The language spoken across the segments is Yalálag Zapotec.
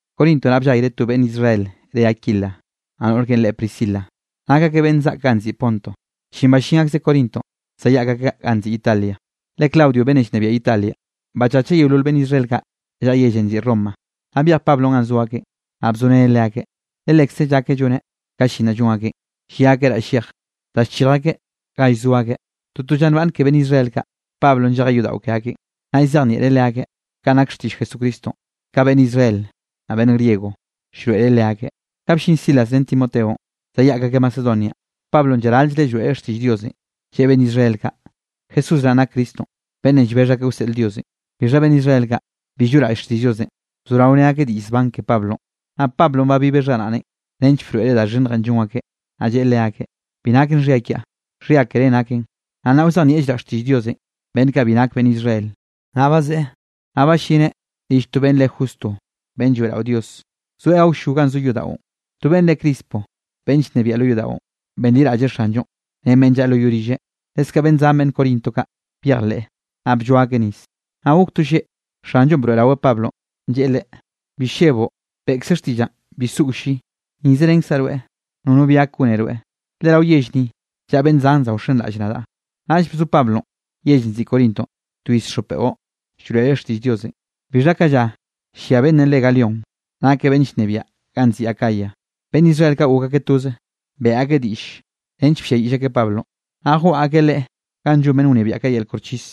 Corinto naꞌ ballayreꞌ to beꞌnn Israel re Aquila, naꞌ noꞌr keꞌen reꞌe Priscila, nak akeꞌ beꞌnn zaꞌk ganꞌ nziꞌi Ponto. Chin ballín akzeꞌ Corintonꞌ zayaꞌk akeꞌ ganꞌ nziꞌi Italia, le Claudio beꞌnnenꞌ llnebiaꞌ Italia, bachacheꞌ yeolol beꞌnn Israel kaꞌ llaꞌa yellenꞌ nziꞌi Roma. Naꞌ byej Pablonꞌ ganꞌ zo akeꞌn, naꞌ bzoreneꞌ leakeꞌ, le lekze llakeꞌ lloneꞌ ka llin naꞌ llon akeꞌn, llia akeꞌ raꞌll llej da llchirj akeꞌ ga llzo akeꞌ. Toto lla nbaꞌnne ke beꞌnn Israel kaꞌ, Pablonꞌ llejeꞌ yodaꞌo ke akeꞌn, naꞌ llzejnieꞌreꞌ leakeꞌ kanꞌ nak xtiꞌll Jesucristonꞌ ka beꞌnn Israel, naꞌ beꞌnn griego, llroeꞌreꞌ leakeꞌ. Ka bllin Silas ren Timoteonꞌ, zayaꞌk akeꞌ Macedonia, Pablonꞌ llaral-llreꞌ llroeꞌreꞌ xtiꞌll Diosenꞌ, lleꞌe beꞌnn Israel kaꞌ, Jesús naꞌn nak Cristonꞌ beꞌnnenꞌ llbexh akeꞌ wseꞌl Diosenꞌ. Bixha beꞌnn Israel kaꞌ, bi lloꞌraꞌll xtiꞌll Diosenꞌ, bzorao ne akeꞌ diꞌll zban ke Pablonꞌ. Naꞌ Pablonꞌ babibeꞌ xharaꞌneꞌn nench broeꞌreꞌ da xhinnjenꞌ llon akeꞌ, naꞌ lleꞌe leakeꞌ: —Bi naken xhia kiaꞌ, xhia ke reꞌ naken, naꞌ nnaꞌ wzejnieꞌllraꞌ xtiꞌll Diosenꞌ beꞌnn kaꞌ bi nak beꞌnn Israel. Naꞌ bazeꞌe, naꞌ ballineꞌ rill to beꞌnn re Justo beꞌnn lloeꞌrao Dios, zoeꞌ awllo ganꞌ zo yodaꞌon. To beꞌnn re Crispo beꞌnn llnebiaꞌ lo yodaꞌon, benliraꞌlleꞌ Xanllonꞌ ren beꞌnn llaꞌa lo yoꞌ rilleꞌ, leskaꞌ beꞌnn zan beꞌnn Corinto kaꞌ byejleꞌ, naꞌ blloa akeꞌ nis. Naꞌ gok to lleꞌ, Xanllonꞌ broeꞌraweꞌ Pablonꞌ, lleꞌe leꞌe: —Bi lleboꞌ, beꞌkze xtiꞌllaꞌn, bi soꞌo lli. Ni zerenkzaꞌ rweꞌ nono bi gak gone rweꞌ, le rao yell ni llaꞌa beꞌnn zan za wxenraꞌll nadaꞌ. Naꞌll bzo Pablonꞌ yellenꞌ nziꞌi Corintonꞌ twiz xop beꞌo, llroeꞌreꞌ xtiꞌll Diosenꞌ. Bixha ka lla llia beꞌnne re Galión, nakeꞌ beꞌnn llnebiaꞌ ganꞌ nziꞌi Acaya, beꞌnn Israel kaꞌ gok akeꞌ toze, beꞌe akeꞌ diꞌll nench blliayiꞌll akeꞌ Pablonꞌ, naꞌ jwaꞌa akeꞌ leꞌe ganꞌ llon beꞌnn wnebiaꞌ kaꞌ yel koxchis.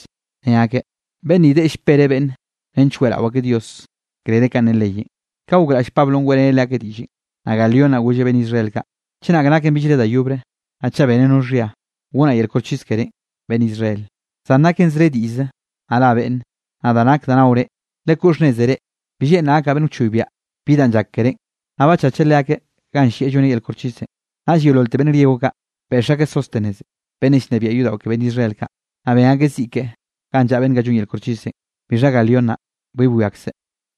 Ne akeꞌ: —Beꞌnn ni deꞌe llpereꞌ beꞌnne, nench weꞌrao akeꞌ Diosenꞌ krere kanꞌ ne leyenꞌ. Ka gokraꞌll Pablonꞌ weꞌreneꞌ leakeꞌ diꞌllenꞌ, naꞌ Galión naꞌ golleꞌ beꞌnn Israel kaꞌ: —Chenak naken billre da yobre, naꞌ chaꞌ beneꞌ no xhia, gonaꞌ yel koxchis kerénꞌ, beꞌnn Israel. Zan naken zre diꞌllze, naꞌ ra beꞌnne, naꞌ da nak da naore, lekoꞌ xhnneze reꞌ, bi lleꞌnraꞌ gakaꞌ beꞌnn wchoybiaꞌ bi danꞌ llak kerénꞌ. Naꞌ bachacheꞌ leakeꞌ ganꞌ llieꞌ lloneꞌ yel koxchisenꞌ. Naꞌll yeololte beꞌnn griego kaꞌ, beꞌx akeꞌ Sóstenes beꞌnnenꞌ llnebiaꞌ yodaꞌo ke beꞌnn Israel kaꞌ, naꞌ ben akeꞌ ziꞌ keꞌe ganꞌ llaꞌa beꞌnn kaꞌ llon yel koxchisenꞌ, bixha Galión naꞌ, bi bwiakzeꞌ.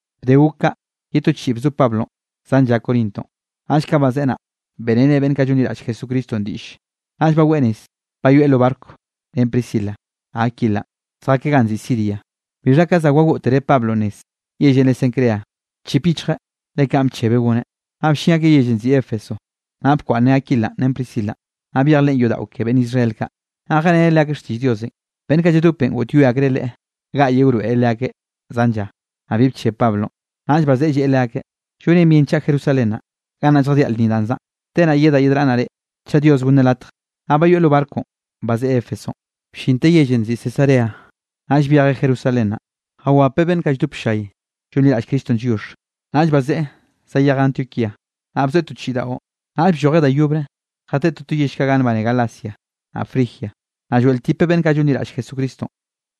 Bde gok kaꞌ, ye to chiꞌi bzo Pablonꞌ zan lla Corintonꞌ. Naꞌll ka bazeꞌe naꞌ, beꞌreneꞌ beꞌnn kaꞌ llonliraꞌll Jesucristonꞌ diꞌlle, naꞌll baweꞌ nez bayoeꞌ lo barco ren Priscila, naꞌ Aquilanꞌ, zjakeꞌ ganꞌ nziꞌi Siria. Bixha ka za wagoꞌtere Pablonꞌ nez yellenꞌ re Cencrea, bchip yichjeꞌ le kanꞌ bchebeꞌ goneꞌ. Naꞌ bllin akeꞌ yellenꞌ nziꞌi Éfeso, naꞌ bkwaꞌnneꞌ Aquila ren Priscilanꞌ, naꞌ byej leꞌen yodaꞌo ke beꞌnn Israel kaꞌ, naꞌ jeꞌreneꞌ leakeꞌ xtiꞌll Diosenꞌ. Beꞌnn kaꞌ lladopenꞌ goꞌtyoe akreꞌ leꞌe gaꞌyeꞌ wroeꞌreꞌ leakeꞌ zan lla, naꞌ bi bcheb Pablonꞌ. Naꞌll bazeꞌe lleꞌe leakeꞌ: —Llonen bien chaꞌa Jerusalén naꞌ, gannaꞌ lljadiaꞌ lnni danꞌ zaꞌa. Te naꞌ yedaꞌ yedraꞌnnaꞌ reꞌ, chaꞌ Dios gonneꞌ latj. Naꞌ bayoeꞌ lo barconꞌ, bazeꞌe Éfesonꞌ. Bllinteꞌ yellenꞌ nziꞌi Cesarea, naꞌll byejeꞌ Jerusalén naꞌ, jawapeꞌ beꞌnn kaꞌ lldop ll-llay llonliraꞌll Cristonꞌ lliox, naꞌll bazeꞌe zayejeꞌ Antioquía. Naꞌ bzoeꞌ to chiꞌi daꞌo, naꞌll bllojeꞌ da yobre jateꞌe toto yell kaꞌ ganꞌ nbane Galacia, naꞌ Frigia, naꞌ lloeꞌltipeꞌ beꞌnn kaꞌ llonliraꞌll Jesucristonꞌ.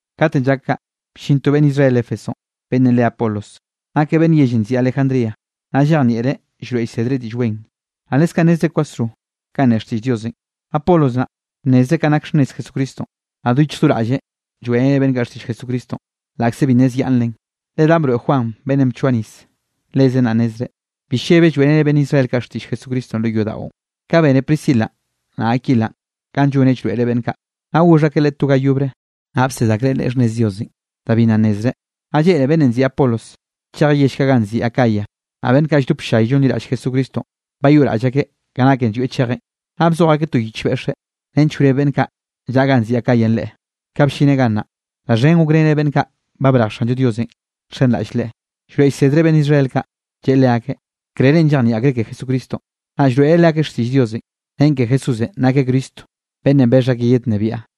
Katenꞌ llak kaꞌ, bllin to beꞌnn Israel Éfesonꞌ beꞌnnenꞌ re Apolos, nakeꞌ beꞌnn yellenꞌ nziꞌi Alejandría, naꞌ llejnieꞌreꞌ llroeꞌ llsedreꞌ Diꞌll Wen, naꞌ leskaꞌ nnezreꞌ kwasro kanꞌ ne xtiꞌll Diosenꞌ. Apolos naꞌ bnnezreꞌ kanꞌ nak xhnnez Jesucristonꞌ. Naꞌ do yichj do raꞌlleꞌ lloeꞌreneꞌ beꞌnn kaꞌ xtiꞌll Jesucristonꞌ, laꞌkze bi nnezyaꞌnnreꞌn, le danꞌ broeꞌ Juan beꞌnnenꞌ bchoa nis, lezen naꞌ nnezreꞌ. Bi llebeꞌ llroeꞌreꞌ beꞌnn Israel kaꞌ xtiꞌll Jesucristonꞌ lo yodaꞌon. Ka bene Priscilanꞌ naꞌ Aquilanꞌ kanꞌ lloneꞌ llroeꞌreꞌ beꞌnn kaꞌ, naꞌ goxh akeꞌ leꞌe to ga yobre, naꞌ bsed akreꞌ leꞌe xhnnez Diosenꞌ da bi nna nnezreꞌ. Naꞌ lleꞌne beꞌnnenꞌ nziꞌi Apolos chejeꞌ yell kaꞌ ganꞌ nziꞌi Acaya, naꞌ beꞌnn kaꞌ lldop ll-llay llonliraꞌll Jesucristonꞌ, bayoꞌraꞌll akeꞌ ka naken llwieꞌ chejeꞌn. Naꞌ bzoj akeꞌ to yich beꞌxeꞌ, nench wreb beꞌnn kaꞌ llaꞌa ganꞌ nziꞌi Acayanꞌ leꞌe. Ka bllineꞌ gannaꞌ, da xhen gokreneꞌ beꞌnn kaꞌ ba brej Xanllo Diosenꞌ nxenraꞌll Leꞌe. Llroeꞌ llsedreꞌ beꞌnn Israel kaꞌ, lleꞌe leakeꞌ, krerenꞌ llejnieꞌ akreꞌ ke Jesucristonꞌ, naꞌ llroeꞌreꞌ leakeꞌ xtiꞌll Diosenꞌ, nen ke Jesúsenꞌ nakeꞌ Cristo beꞌnnenꞌ bexh akeꞌ yednnebiaꞌ.